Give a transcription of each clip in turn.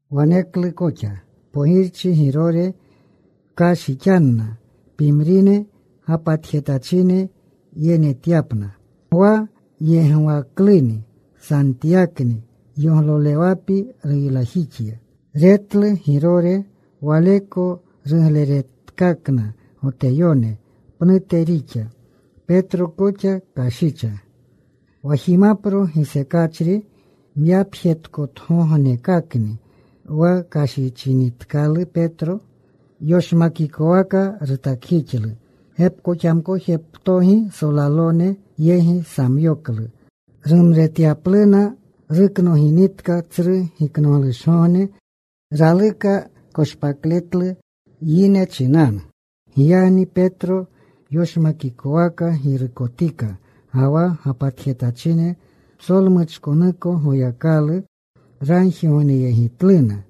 Waneklu koxa pogirchi Girore kashichjixanna pimrine gapatjetachine yenetyapna. Gwa yegwakluni Santyakni yoglolewapi ruylajixya. Retlu Girore waleko rugleretkakna Goteyone, pnute rixa. Petro koxa kashicha. Wa jimapro gisekachri myapjetkotgognekakni. Wa kashichinitkalu Petro, yoshmakikowaka rutakjixlu. Gepkoxamkojeptogi solalone yegi samyoklu, rumretyapluna. Ruknoginitka Tsru Giknoglushgogne raluka koshpakletlu yine chinanu. Giyagni Petro yoshmakikowaka girukotika. Ga wa gapatjetachine psolmuchkonuko Goyakalu ragjigogneyegitluna.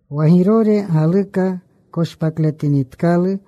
Wa Girore galuka koshpakletinitkalu,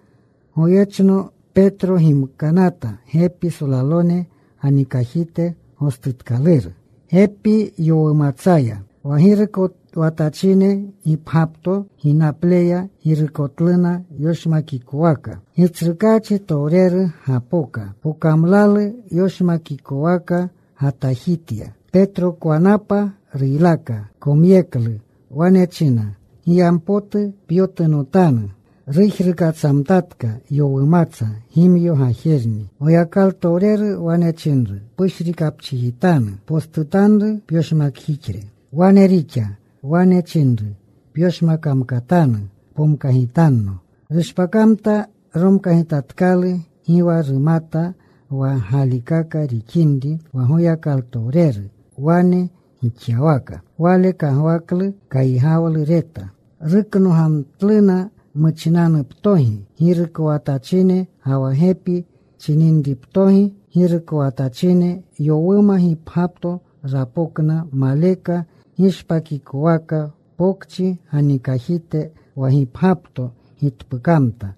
walyechno Petro gimkanata gepi solalone ganikajite. Gostutkaluru gepi yowumatsaya. Wa girukowatachine gipgyapto ginapleya girukotluna yoshmakikowaka. Gitsrukaachitowreru gapoka. Pokamlalu yoshmakikowaka gatajitya. Petrokwanapa ruylaka. Komyeklu. Wane china, “Giyampotu pyotunotanu.” Rujrukatsamtatka yowumatsa gimyo gajerni. Goyakalutowreru wane chinru, “Pushrikapchijitanu. Postutanru pyoshmakjixre.” Wane rixa. Wane chinru, “Pyoshmamkatanu. Pomkagitanno.” Rushpakamta. Romkagimtatkalu. Gi wa rumata wa galikaka rixinri wa Goyakalutowreru wane gixyawaka. Wale kagwaklu kaygawlu reta. Ruknogamtluna muchinanuptogi girukowatachine, ga wa gepi chininriptogi girukowatachine. Yowuma gipgyapto rapokna, maleka gishpakikowaka, pokchi ganikajite. Wa gipgyapto gitpukamta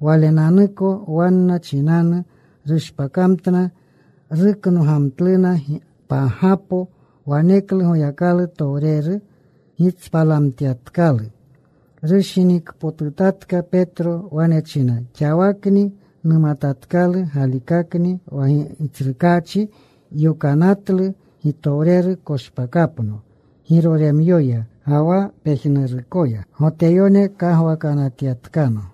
walenanuko wanna chinanu. Rushpakamtna. Ruknogamtluna pagapo. Waneklu Goyakalu towreru gitspalamtyatkalu. Rushinikpotutatka Petro. Wane china, “Xawakni numatatkalu galikakni wa Gitsrukaachi yokanatlu gitowreru; koshpakapno Giroremyoya, ga wa pejnurukoya Goteyone kagwakanatyatkano.”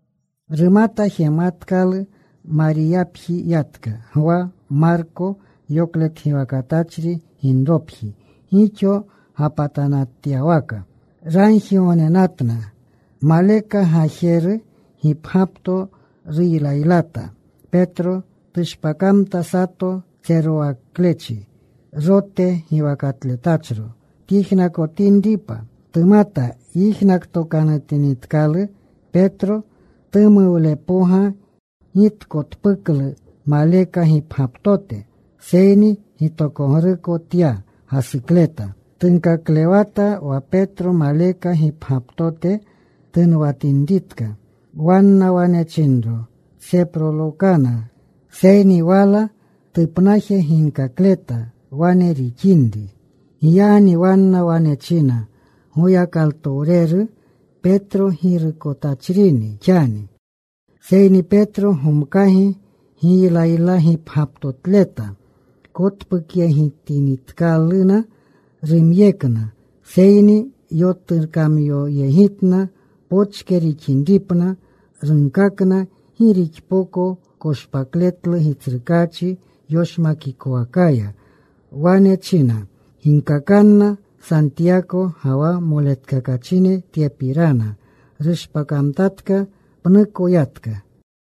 Rumata jematkalu. Mariyapji yatka. Gwa, Marko yokletgiwakatachri ginropji, gixo gapatanatyawaka. Ragjigognenatna. Maleka gajeru gipgyapto ruylaylata Petro. Tushpakamta sato tserowaklechi, Rote giwakatletachro, tyijnakotinripa. Tumat yijnakootokanutinitkalu Petro, tumuwlepoga gi tkotpuklu maleka gipgyaptote. Seyni gitokogruko tya gasukleta. Tunkaklewata wa Petro maleka gipgyaptote tunwatinritka. Wanna wane chinro, “Pseprolokana.” Seyni wala tupnaje ginkakleta wane rixinri. Giyagni wanna wane china, “Goyakalutowreru, Petro girukotachrini xani.” Seyni Petro gomkagi giylaylagipgyaptotleta. Kotpukyegitinitkaluna. Rumyekna. Seyni yotukamyoyegitna pochke rixinripna. Runkakna gi rixpoko koshpakletlu Gitsrukaachi yoshmakikowakaya. Wane china, “Ginkakanna Santiyako ga wa moletkakachine tye pirana.” Rushpakamtatka. Pnuko yatka.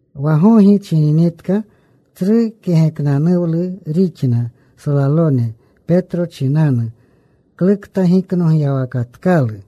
Wa gogi chininitka tsru kegeknanuwlu rixna solalone Petro chinanu klukta giknogyawakatkalu.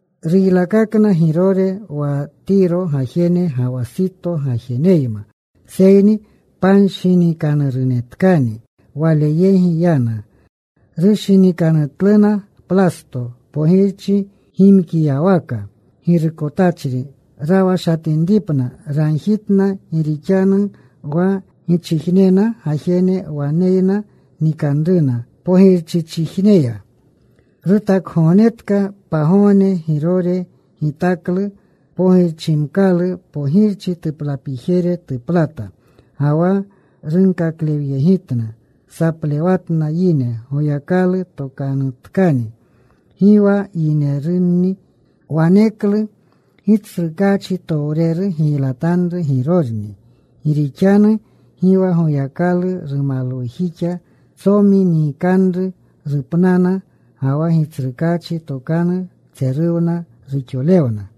Ruylakakna Girore wa Tiro gajene ga wa Sito gajeneyma. Seyni panshinikanurunetkani wale yegi yana. Rushinikanutluna Plasto, pogirchi gimkiyawaka girukotachri. Rawashatinripna ragjitna, gi rixanu wa gichijnena gajene waneyna nikanruna pogirchichijneya. Rutakgognetka pagogne. Girore gitaklu pogirchimkalu. Pogirchi tuplapijere tuplata, ga wa runkaklewyegitna. Saplewatna yine, “Goyakalu tokanuktani. Gi wa yinerunni.” Waneklu Gitsrukaachitowreru giylatanru Girorni, gi rixanu gi wa Goyakalu rumalwujixa. Tsomi nikanru. Rupnana. Ga wa Gitsrukaachi tokanu tseruwna. Ruxolewna.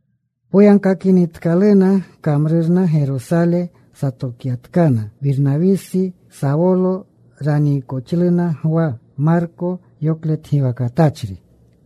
Poyagkakinitkaluna kamrurna Gerosale satokyatkana Wirnawisi, Sawolo. Raniikoxluna Gwa, Marko yoklegiwakatletachri.